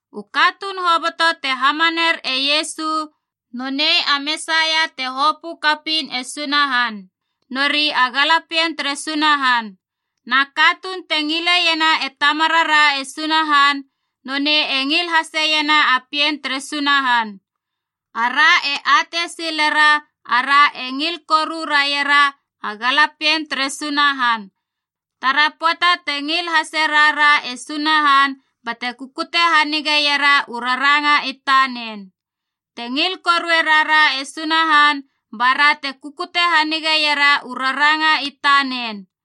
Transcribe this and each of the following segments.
U katuun hoboto te hamaner e Iesu nonei a Mesaia te hopö kapiin e Sunahan, nori a galapien tere Sunahan. Na katuun te ngileiena e Tamarara e Sunahan, nonei e ngil haseiena a pien tere Sunahan. Ara e atei silera ara e ngil koru raiera a galapien tere Sunahan, tara pöata te ngil hase rara e Sunahan bate kukute hanigeiera u raranga i tanen. Te ngil korue rara e Sunahan ba ra te kukute hanigeiera u raranga i tanen.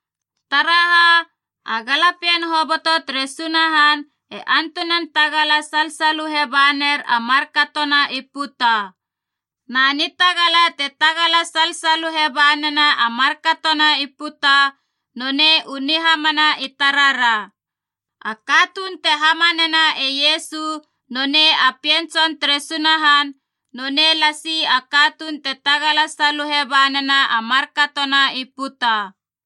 Taraha, a galapien hoboto tere Sunahan e antunan tagala salsaluhe baner a markatona i puta. Na nitagala te tagala salsaluhe ba nena a markatona i puta nonei u nihamana i tarara. A katuun te hamanena e Iesu nonei a Pien Tson tere Sunahan, nonei lasi a katuun te tagala saluhe banena a markatona i puta.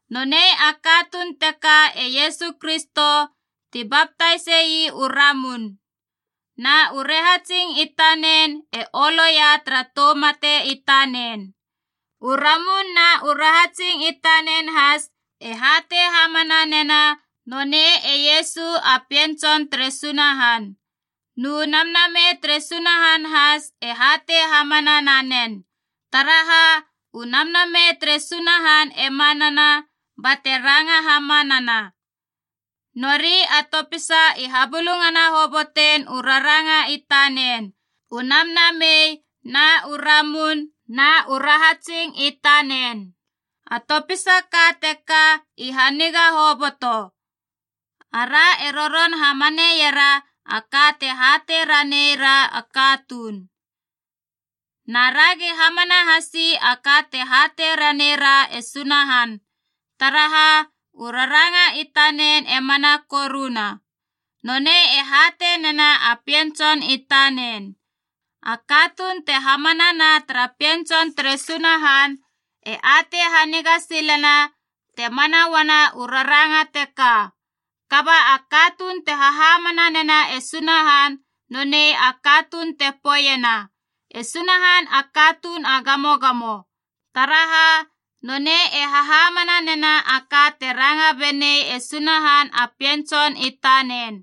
Nonei a katuun teka e Iesu Kristo, ti baptaise ii u ramun. Na u rahatsing i tanen e oloia tara tou mate i tanen. U ramun na u rahatsing i tanen has e hatei hamana nena nonei e Iesu a Pien Tson tere Sunahan. Nu Namnamei tere Sunahan has e hatei hamana nanen, taraha u Namnamei tere Sunahan e manana bate ranga hamanana. Nori a topisa i habulungana hobotein u raranga i tanen, u Namnamei, na u ramun, na u rahatsing i tanen. A topisa ka teka i haniga hoboto. Ara e roron hamaneiera a ka te hatei ranei ra a katuun. Na ragi hamana hasi a ka te hatei ranei ra e Sunahan, taraha u raranga i tanen e mana koruna. Nonei e hatei nena a Pien Tson i tanen. A katuun te hamanana tara Pien Tson tere Sunahan e atei haniga silena te mana uana u raranga teka. Kaba a katuun te hahamana nena e Sunahan nonei a katuun te poeiena, “E Sunahan a katuun a gamogamo.” Taraha, nonei e hahamana nena a ka te ranga benei e Sunahan a Pien Tson i tanen.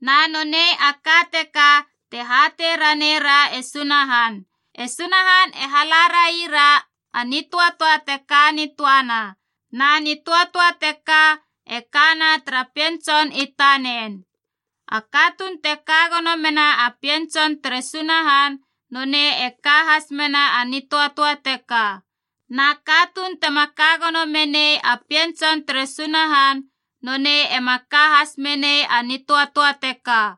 Na nonei a ka teka te hatei raneira e Sunahan: e Sunahan e hala raira a nitöatöa te ka nitöana, na nitöatöa teka e kana tara Pien Tson i tanen. A katuun te ka gono mena a Pien Tson tere Sunahan nonei e ka has mena a nitöatöa teka. Na katuun tema ka gono menei a Pien Tson tere Sunahan nonei ema ka has menei a nitöatöa teka.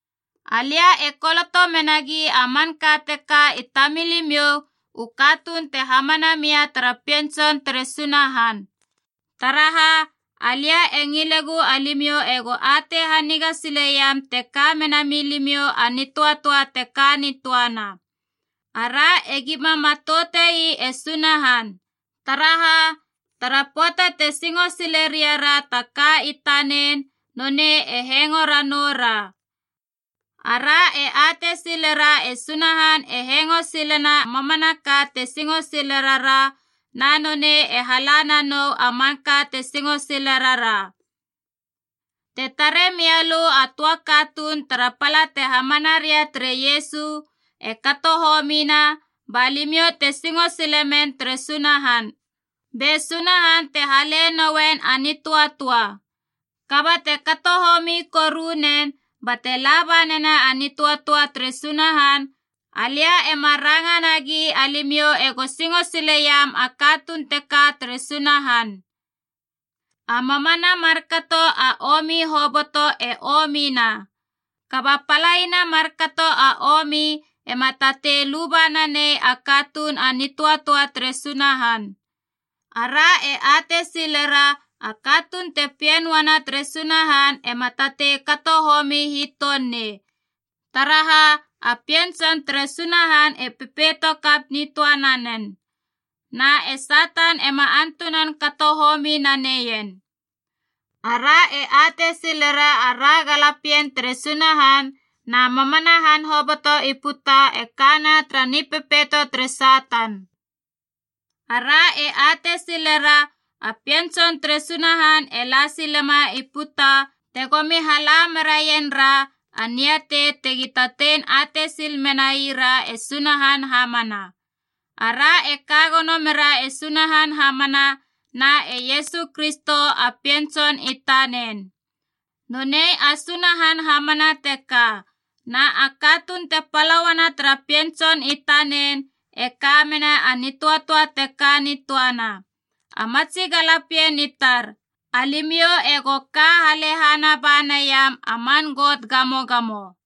Alia e koloto menagi a manka teka i tamilimiou u katuun te hamana mia tara Pien Tson tere Sunahan, taraha alia e ngilegu alimiou ego atei haniga sileiam te ka mena milimiou a nitöatöa te ka nitöana. Ara egima matoute ii e Sunahan, taraha, tara pöata te singo sile riara ta ka i tanen nonei e hengo ranoura. Ara e atei silera e Sunahan e hengo silena mamanaka te singo sile rara, na nonei e hala nanou a manka te singo sile rara. Te tare mialö a töa katuun tara pala te hamana ria tere Iesu e kato homina ba limiou te singo silemen tere Sunahan, be Sunahan te hale noien a nitöatöa. Kaba te kato homi koru nen bate laba nena a nitöatöa tere Sunahan, alia ema ranga nagi alimiou ego singo sileiam a katuun teka tere Sunahan. A mamana markato a omi hoboto e omina. Kaba palaina markato a omi ema tatei luba nanei a katuun a nitöatöa tere Sunahan. Ara e atei silera a katuun te pien uana tere Sunahan ema tatei kato homi hiton nei, taraha a Pien Tson tere Sunahan e pepeito kap nitöa nanen, na e Satan ema antunan kato homi naneien. Ara e atei silera ara galapien tere Sunahan na mamana han hoboto i puta e kana tara nipepeito tere Satan. Ara e atei silera a Pien Tson tere Sunahan e la silema i puta tegomi hala meraien ra a niatei tegi tatei atei sil menai ra e Sunahan hamana. Ara e ka gono mera e Sunahan hamana na e Iesu Kristo a Pien Tson i tanen. Nonei a Sunahan hamana teka, na a katuun te pala uana tara Pien Tson i tanen e ka mena a nitöatöa te ka nitöana. A matsi galapien i tar, alimiou ego ka halehana ba naiam a man got gamogamo.